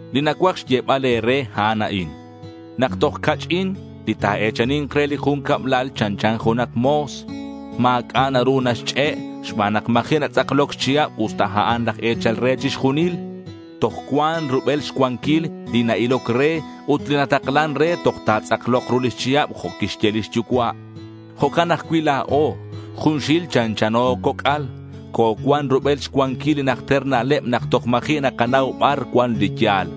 Li nacuaj xyebal e̱re a'an a'in: nak toj ca'ch'in, li ta̱e̱chani̱nk re li jun cablal chanchan junak mo̱s. Ma̱c'a' naru naxch'e' xban nak ma̱ji' natz'akloc xchihab usta a'an laj e̱chal re chixjunil. Toj cuan rubel xcuanquil li na-iloc re ut li nataklan re toj ta̱tz'aklok ru lix chihab jo' quixye lix yucua'. Jo'can ajcui' la̱o. Junxil chanchano coc'al. Cocuan rubel xcuanquil li najter na'leb nak toj ma̱ji' nakanau bar cuan li ya̱l.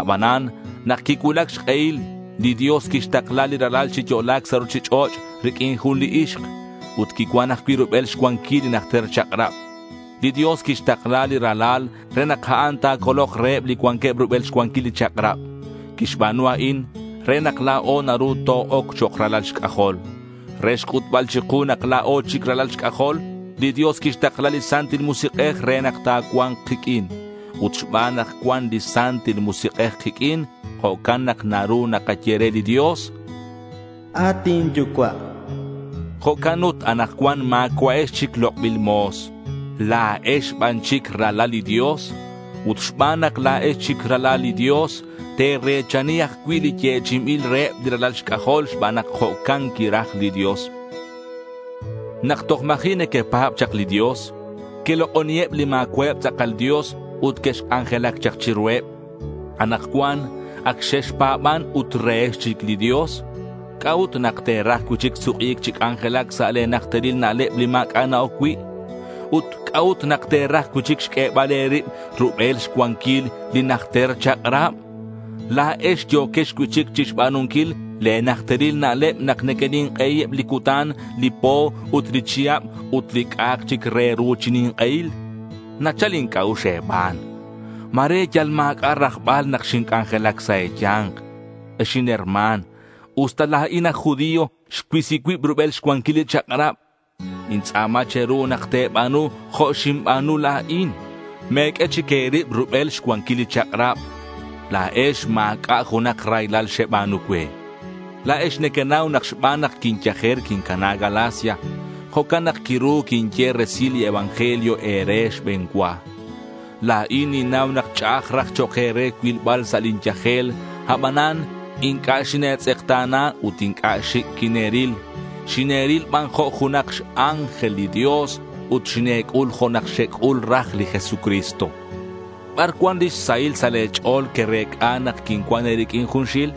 Abanan nak quicuulac xk'ehil, li Dios quixtakla li Ralal chi yo'la̱c sa' ruchich'och' riq'uin jun li ixk. Ut quicuan ajcui' rubel xcuanquil li najter chak'rab. Li Dios quixtakla li Ralal re nak a'an ta̱colok reheb li cuanqueb rubel xcuanquil li chak'rab. Quixba̱nu a'in re nak la̱o naru to-oc chok' ralal xc'ajol. Re xc'utbal chiku nak la̱o chic ralal xc'ajol, li Dios quixtakla li Santil Musik'ej re nak ta̱cua̱nk kiq'uin. Ut xban nak cuan li Santil Musik'ej kiq'uin, jo'can nak naru nakaye re li Dios, “at inYucua'.” Jo'can ut anakcuan ma̱cua'ex chic lok'bil mo̱s. La̱ex ban chic ralal li Dios. Ut xban nak la̱ex chic ralal li Dios, te̱re̱chani ajcui' li yechi'inbil reheb li ralal xc'ajol xban nak jo'can quiraj li Dios. Nak toj ma̱ji' nequepa̱b chak li Dios, quelok'oniheb li ma̱cua'eb tz'akal dios ut quexc'anjelac chak chiruheb. Anakcuan ac xexpa̱ban ut rehex chic li Dios. ¿C'a'ut nak te̱raj cui'chic suk'i̱c chi c'anjelac sa' le̱ najteril na'leb li ma̱c'a' na-oc cui'? Ut ¿c'a'ut nak te̱raj cui'chic xq'uebal e̱rib rubel xcuanquil li najter chak'rab? La̱ex yo̱quex cui'chic chixba̱nunquil le̱ najteril na'leb nak nequenink'ei eb li cutan, li po ut li chihab ut li c'a'ak chic re ru chi nink'ehil. Nachal inc'a'ux e̱ban. Ma̱re yal ma̱c'a' rajbal nak xinc'anjelac sa' e̱ya̱nk. Ex inherma̱n, usta la̱in aj judío, xcuisi cuib rubel xcuanquil li chak'rab. Nintz'a̱ma che̱ru nak te̱ba̱nu jo' xinba̱nu la̱in. Me̱q'ue chic e̱rib rubel xcuanquil li chak'rab. La̱ex ma̱c'a' junak raylal xeba̱nu cue. La̱ex nequenau nak xban nak quinyajer, quincana Galacia. Jo'can nak quiru quinye resil li evangelio e̱re xbe̱n cua. La̱in ninnau nak ch'a'aj raj chok' e̱re cuilbal sa' lin yajel. Abanan inc'a' xine̱tz'ekta̱na ut inc'a' xic' quine̱ril. Xine̱ril ban jo' junak x-ángel li Dios ut xine̱c'ul jo' nak xec'ul raj li Jesucristo. ¿Bar cuan lix sahil sa' le̱ ch'o̱l querec'a nak quincuan e̱riq'uin junxil?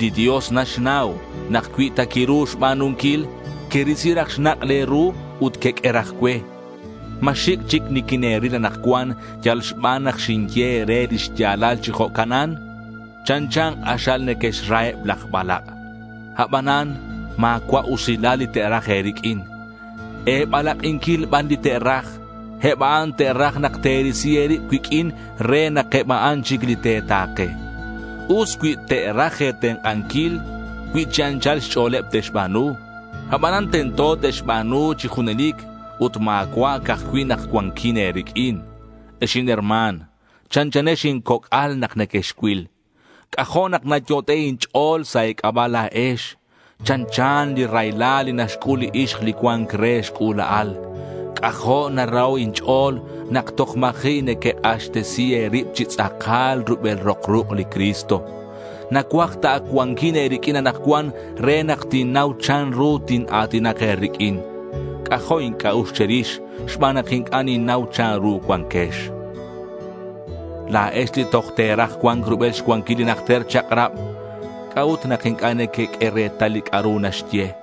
Li Dios naxnau nak cui ta quiru xba̱nunquil, querisi raj xnak' le̱ ru ut queq'ue raj cue. ¿Ma xic' chic niquine̱ril anakcuan yal xban nak xinye e̱re li xya̱lal chi jo'canan? Chanchan k'axal nequera eb laj balak'. Abanan ma̱cua' usilal li te'raj e̱riq'uin. E̱balak'inquil ban li te'raj. Eb a'an te'raj nak te̱risi e̱rib cuiq'uin re nak eb a'an chic li te̱ta̱ke. Us cui te'raj e̱tenk'anquil cui chi anchal xch'o̱leb te'xba̱nu. Abanan tento te'xba̱nu chi junelic ut ma̱cua' ca'aj cui' nak cuanquin e̱riq'uin. Ex inherma̱n, chanchanex incoc'al nak nequexcuil. C'ajo' nak nayot'e' inch'o̱l sa' e̱c'aba' la̱ex. Chanchan li raylal li naxc'ul li ixk li cua̱nc re xc'ula'al. C'ajo' naraho' inch'o̱l nak toj ma̱ji' nequek'axtesi e̱rib chi tz'akal rubel rok ruk' li Cristo. Nacuaj ta ac cuanquin e̱riq'uin anakcuan re nak tinnau chanru tina̱tinak e̱riq'uin. C'ajo' inc'a'ux che̱rix xban nak inc'a' ninnau chanru cuanquex. La̱ex li toj te̱raj cua̱nc rubel xcuanquil li najter chak'rab, ¿c'a'ut nak inc'a' nequeq'ue retal li c'a'ru naxye?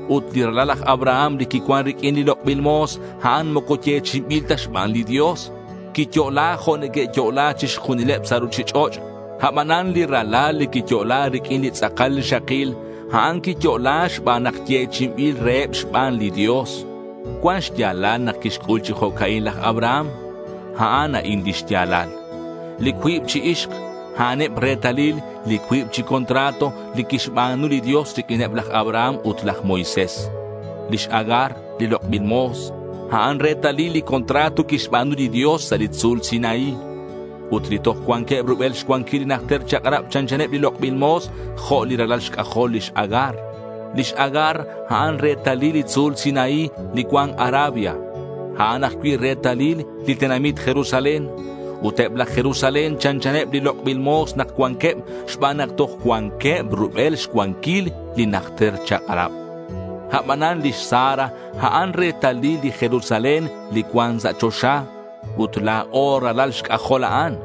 Ut li ralal laj Abraham li quicuan riq'uin li lok'bil mo̱s, a'an moco yechi'inbil ta xban li Dios. Quiyo'la jo' neque'yo'la chixjunileb sa' ruchich'och'. Abanan li ralal li quiyo'la riq'uin li tz'akal rixakil, a'an quiyo'la xban nak yechi'inbil reheb xban li Dios. Cuan xya̱lal nak quixc'ul chi jo'ca'in laj Abraham. A'an a'in lix ya̱lal: Li cuib chi ixk, a'aneb retalil li cuib chi contrato li quixba̱nu li Dios riq'uineb laj Abraham ut laj Moisés. Lix Agar, li lok'bil mo̱s, a'an retalil li contrato quixba̱nu li Dios sa' li tzu̱l Sinaí. Ut li toj cuanqueb rubel xcuanquil li najter chak'rab chanchaneb li lok'bil mo̱s jo' li ralal xc'ajol lix Agar. Lix Agar, a'an retalil li tzu̱l Sinaí li cuan Arabia. A'an ajcui' retalil li tenamit Jerusalén. Ut eb laj Jerusalén chanchaneb li lok'bil mo̱s nak cuanqueb, xban nak toj cuanqueb rubel xcuanquil li najter chak'rab. Abanan lix Sara, a'an retalil li Jerusalén li cuan sa' choxa. Ut la̱o ralal xc'ajol a'an.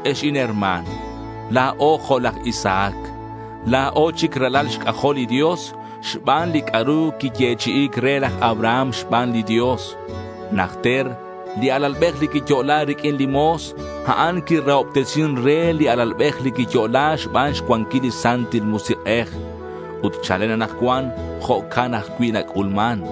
Ex inherma̱n, la̱o jo' laj Isaac. La̱o chic ralal xc'ajol li Dios xban li c'a'ru quiyechi'i̱c re laj Abraham xban li Dios. Najter li alalbej li quiyo'la riq'uin li mo̱s, a'an quirahobtesin re li alalbej li quiyo'la xban xcuanquil li Santil Musik'ej. Ut chalen anakcuan jo'can ajcui' nac'ulman.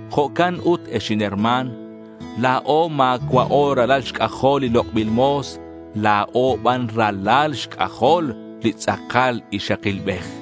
Jo'can ut, ex inherma̱n, la̱o ma̱cua'o ralal xc'ajol li lok'bil mo̱s. La̱o ban ralal xc'ajol li tz'akal ixakilbej.